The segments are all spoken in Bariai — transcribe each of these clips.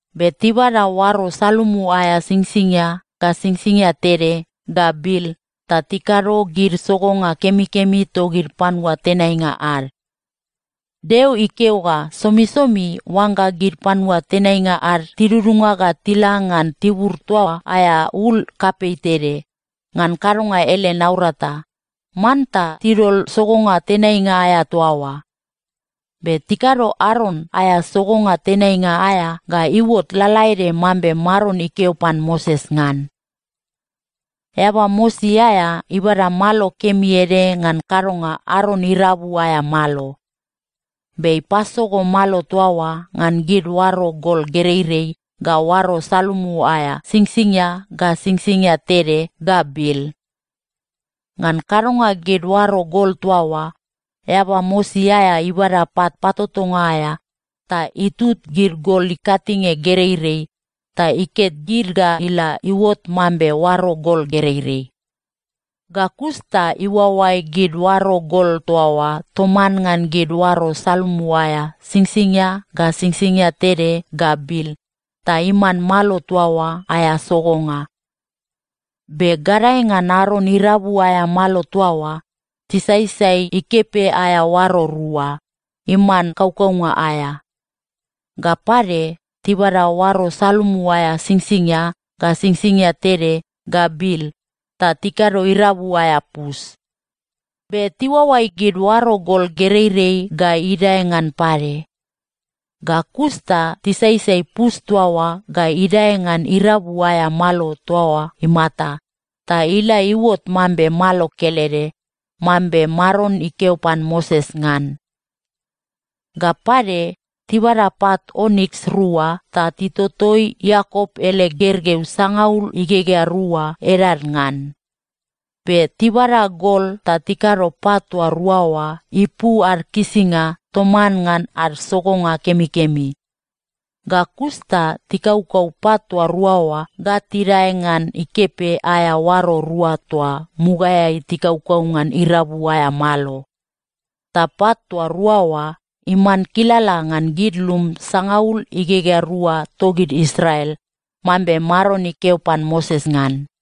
Be tibada oaro salumu aea singsingia ga singsingia tede ga bil ta tikado gid sogonga kemikemi togid panua tenainga ad. Deo ikeo ga somisomi oangga gid panua tenainga ad tidudunga ga tila ngan tibur toa aea ul kapei tede, ngan kadonga ele naurata, manta tidol sogonga tenainga aea toa oa. Be tikado Aron aea sogonga tenainga aea ga iuot lalaede mambe Maron ikeo pan Moses ngan. Eaba mosi aea ibada malo kemi ede ngan kadonga Aron irabu aea malo. Be ipasogo malo toa oa ngan gid oaro gol gereirei ga oaro salumu aea singsingia ga singsingia tede ga bil. Ngan kadonga gid oaro gol toa oa, eaba mosi aea ibada pat patotonga aea ta itut gid gol ikatinge gereirei ta iket gid ga ila iuot mambe oaro gol gereirei. Ga kus ta iuaoai gid oaro gol toa oa toman ngan gid oaro salumu aea singsingia ga singsingia tede ga bil, ta iman malo toa oa aea sogonga. Be gadae ngan Aron irabu aea malo toa oa, tisaisai ikepe aea oaro rua, iman kaukaunga aea. Ga pade, tibada oaro salumu aea singsingia ga singsingia tede ga bil ta tikado irabu aea pus. Be tiuaoai gid oaro gol gereirei ga idae ngan pade. Ga kus ta tisaisai pus toa oa ga idae ngan irabu aea malo toa oa imata, ta ila iuot mambe malo kelede, mambe Maron ikeo pan Moses ngan. Ga pade, tibada pat oniks rua ta titotoi Iakop ele gergeu sangaul igegea rua edad ngan. Be tibada gol ta tikado pat toa rua oa ipu ad kisinga toman ngan ad sogonga kemikemi. Ga kus ta tikaukau pat toa rua oa ga tidae ngan ikepe aea oaro rua toa mugaeai tikaukau ngan irabu aea malo. Ta pat toa rua oa iman kilala ngan gid lum sangaul igegea rua togid Israel, mambe Maron ikeo pan Moses ngan.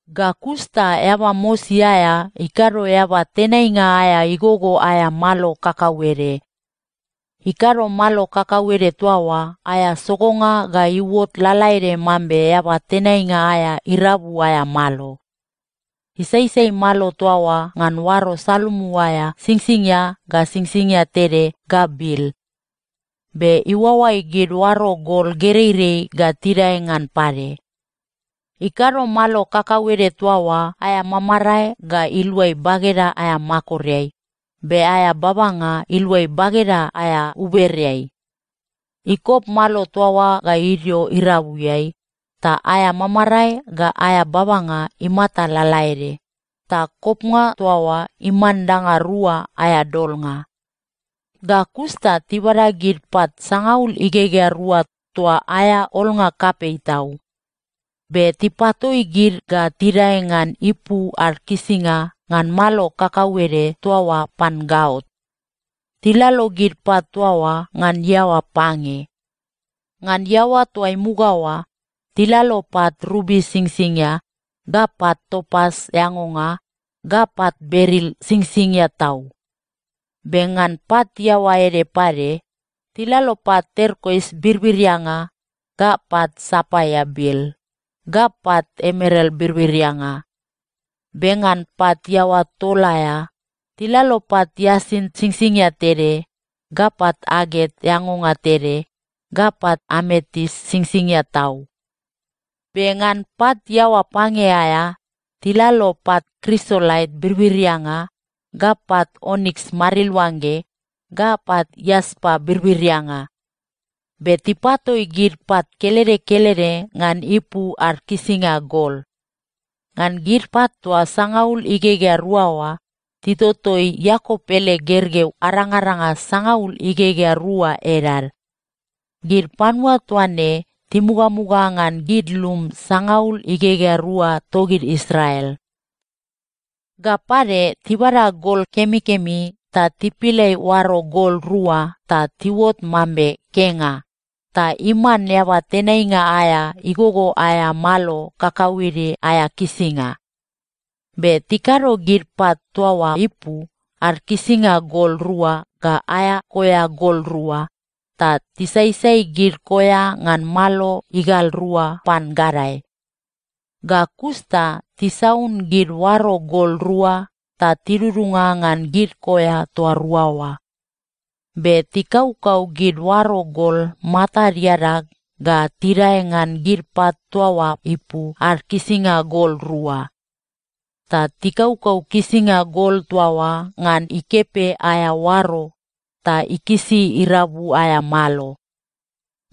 Ga kus ta eaba mosi aea ikado eaba tenainga aea igogo aea malo kakauede. Ikado malo kakauede toa oa aea sogonga ga iuot lalaede mambe eaba tenainga aea irabu aea malo. Isaisai malo toa oa ngan oaro salumu aea singsingia ga singsingia tede ga bil. Be iuaoai gid oaro gol gereirei ga tidae ngan pade. Ikado malo kakauede toa oa aea mamarae ga iluai bageda aea makoreai, be aea babanga iluai bageda aea ubereai. Ikop malo toa oa ga idio irabuiai, ta aea mamarae ga aea babanga imata lalaede, ta kopnga toa oa iman danga rua aea dolnga. Ga kus ta tibada gid pat sangaul igegea rua toa aea olnga kapei tau. Be tipatoi gid ga tidae ngan ipu ad kisinga ngan malo kakauede toa oa pan gaot. Tilalo gid pat toa oa ngan iaoa pange. Ngan iaoa toa imuga oa, tilalo pat rubi singsingia, ga pat topas eangonga, ga pat beril singsingia tau. Be ngan pat iaoa ede pade, tilalo pat terkois birbirianga, ga pat sapaia bil, ga pat emeral birbirianga. Be ngan pat iaoa tol aea, tilalo pat iasint singsingia tede, ga pat aget eangonga tede, ga pat ametis singsingia tau. Be ngan pat iaoa pange aea, tilalo pat krisolait birbirianga, ga pat oniks mariluangge, ga pat iaspa birbirianga. Be tipatoi gid pat kelede kelede ngan ipu ad kisinga gol. Ngan gid pat toa sangaul igegea rua oa, titotoi Iakop ele gergeu arangaranga sangaul igegea rua edad. Gid panua toa ne timugamuga ngan gid lum sangaul igegea rua togid Israel. Ga pade, tibada gol kemikemi ta tipilai oaro gol rua ta tiuot mambe kenga, ta iman eaba tenainga aea igogo aea malo kakauede aea kisinga. Be tikado gid pat toa oa ipu ad kisinga gol rua ga aea koea gol rua, ta tisaisai gid koea ngan malo igal rua pan gadae. Ga kus ta tisaun gid oaro gol rua ta tidudunga ngan gid koea toa rua oa. Be tikaukau gid oaro gol matad iadag ga tidae ngan gid pat toa oa ipu ad kisinga gol rua. Ta tikaukau kisinga gol toa oa ngan ikepe aea oaro ta ikisi irabu aea malo.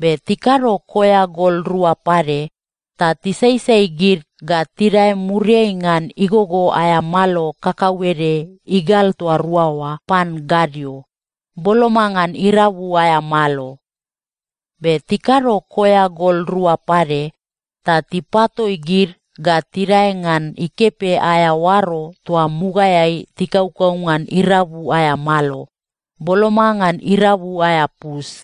Be tikado koea gol rua pade, ta tisaisai gid ga tidae muriai ngan igogo aea malo kakauede igal toa rua oa pan gadio, boloma ngan irabu aea malo. Be tikado koea gol rua pade, ta tipatoi gid ga tidae ngan ikepe aea oaro toa mugaeai tikaukau ngan irabu aea malo, boloma ngan irabu aea pus.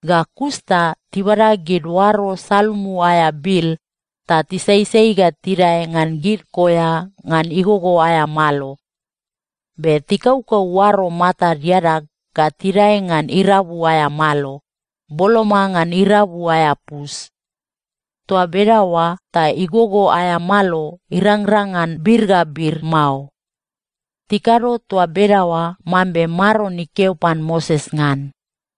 Ga kus ta tibada gid oaro salumu aea bil, ta tisaisai ga tidae ngan gid koea ngan igogo aea malo. Be tikaukau oaro matad iadag ga tidae ngan irabu aea malo, boloma ngan irabu aea pus. Toa bedaoa ta igogo aea malo irangrang ngan bir ga bir mao. Tikado toa bedaoa mambe Maron ikeo pan Moses ngan.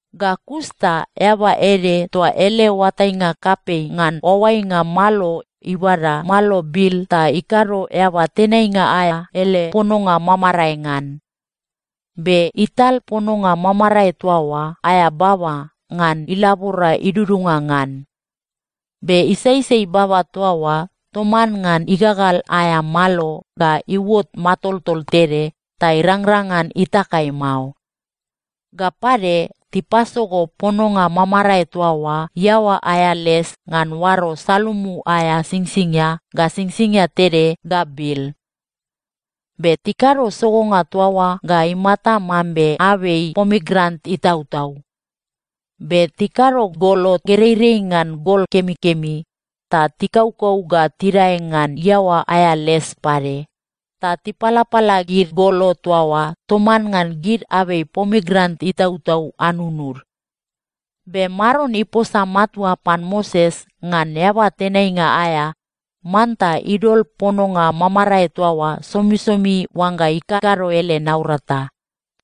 Ga kus ta eaba ede toa ele oatainga kapei ngan oaoainga malo ibada malo bil ta ikado eaba tenainga aea ele pononga mamarae ngan. Be ital pononga mamarae toa oa aea baba ngan ilabora idudunga ngan. Be isaisai baba toa oa toman ngan igagal aea malo ga iuot matoltol tede ta irangrang ngan itakai mao. Ga pade, tipasogo pononga mamarae toa oa iaoa aea les ngan oaro salumu aea singsingia ga singsingia tede ga bil. Be tikado sogonga toa oa ga imata mambe abei pomigranet itautau. Be tikado golo gereirei ngan gol kemikemi, ta tikaukau ga tidae ngan iaoa aea les pade, ta tipalapala gid golo toa oa toman ngan gid abei pomigranet itautau anunud. Be Maron iposa matua pan Moses ngan eaba tenainga aea manta idol pononga mamarae toa oa somisomi oangga ikakado ele naurata.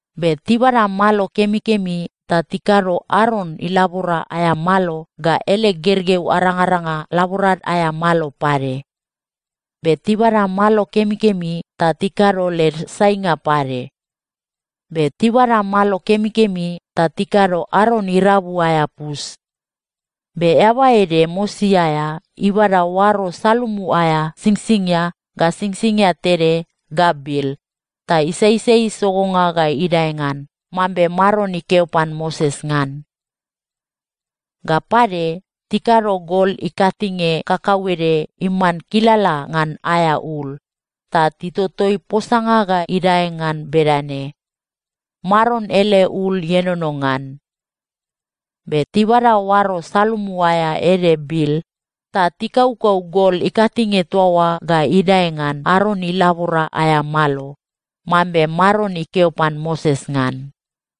Be tibada malo kemikemi ta tikado Aron ilabora aea malo ga ele gergeu arangaranga laborad aea malo pade. Be tibada malo kemikemi ta tikado led sainga pade. Be tibada malo kemikemi ta tikado Aron irabu aea pus. Be eaba ede mosi aea ibada oaro salumu aea singsingia ga singsingia tede ga bil, ta isaisai sogonga ga idae ngan, mambe Maron ikeo pan Moses ngan. Ga pade, tikado gol ikatinge kakauede iman kilala ngan aea ul, ta titotoi posanga ga idae ngan bedane: Maron ele ul ienono ngan. Be tibada oaro salumu aea ede bil ta tikaukau gol ikatinge toa oa ga idae ngan Aron ilabora aea malo, mambe Maron ikeo pan Moses ngan.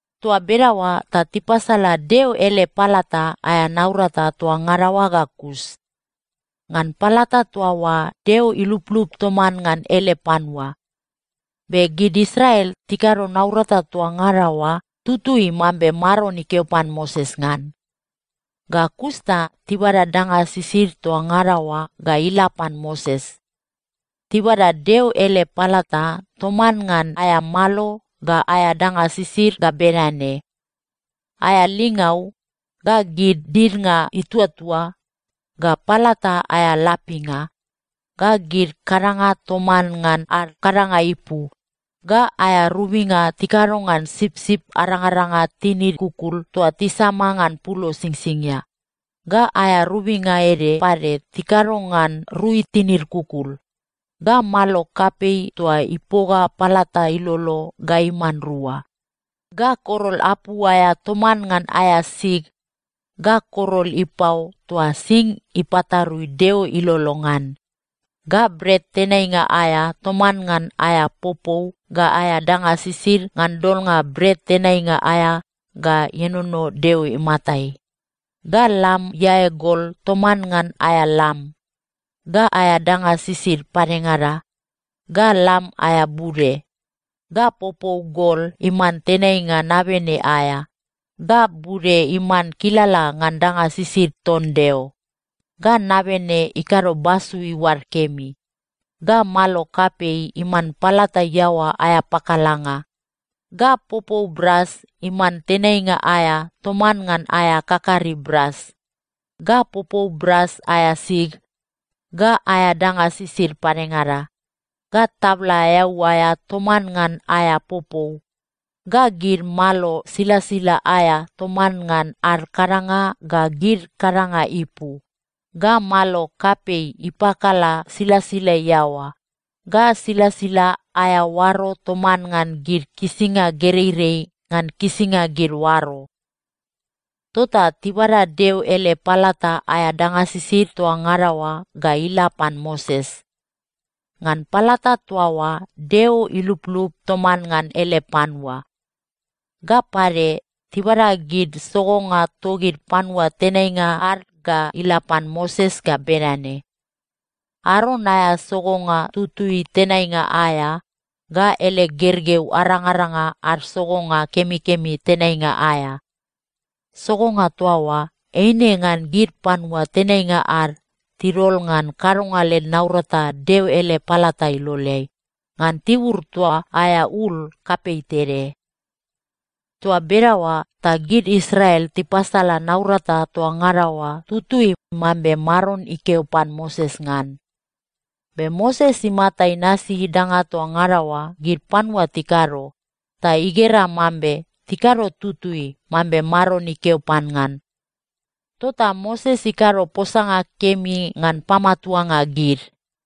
Toa bedaoa ta tipasala Deo ele palata aea naurata toa ngada oa ga kus. Ngan palata toa oa Deo iluplup toman ngan ele panua. Be gid Israel tikado naurata toa ngada oa tutui mambe Maron ikeo pan Moses ngan. Ga kus ta tibada danga sisid toa ngada oa ga ila pan Moses. Tibada Deo ele palata toman ngan aea malo ga aea danga sisid ga bedane: aea lingau, ga gid didnga ituatua, ga palata aea lapinga, ga gid kadanga toman ngan ad kadanga ipu, ga aea robinga tikado ngan sipsip arangaranga tinid kukul toa tisama ngan pulo singsingia, ga aea robinga ede pade tikado ngan rui tinid kukul, ga malo kapei toa ipoga palata ilolo ga iman rua, ga korol apu aea toman ngan aea sig, ga korol ipao toa sing ipatarui Deo ilolo ngan, ga bret tenainga aea toman ngan aea popou ga aea danga sisid ngan dolnga bret tenainga aea ga ienono Deo imatai, ga lam iae gol toman ngan aea lam, ga aea danga sisid padengada, ga lam aea bude, ga popou gol iman tenainga nabene aea, ga bude iman kilala ngan danga sisid ton Deo, ga nabene ikado basu iuad kemi, ga malo kapei iman palata iaoa aea pakalanga, ga popou bras iman tenainga aea toman ngan aea kakari bras, ga popou bras aea sig, ga aea danga sisid padengada, ga tabla eau aea toman ngan aea popou, ga gid malo silasila aea toman ngan ad kadanga ga gid kadanga ipu, ga malo kapei ipakala silasila iaoa, ga silasila aea oaro toman ngan gid kisinga gereirei ngan kisinga gid oaro. Tota tibada Deo ele palata aea danga sisid toa ngada oa ga ila pan Moses. Ngan palata toa oa, Deo iluplup toman ngan ele panua. Ga pade, tibada gid sogonga togid panua tenainga ad ga ila pan Moses ga bedane: Aron aea sogonga tutui tenainga aea, ga ele gergeu arangaranga ad sogonga kemikemi tenainga aea. Sogonga toa oa, eine ngan gid panua tenainga ad tidol ngan kadonga led naurata Deo ele palata iloleai, ngan tibur toa aea ul kapei tede. Toa bedaoa ta gid Israel tipasala naurata toa ngada oa tutui mambe Maron ikeo pan Moses ngan. Be Moses imata inasi danga toa ngada oa gid panua tikado, ta igera mambe tikado tutui mambe Maron ikeo pan ngan. Tota Moses ikado posanga kemi ngan pamatuanga gid.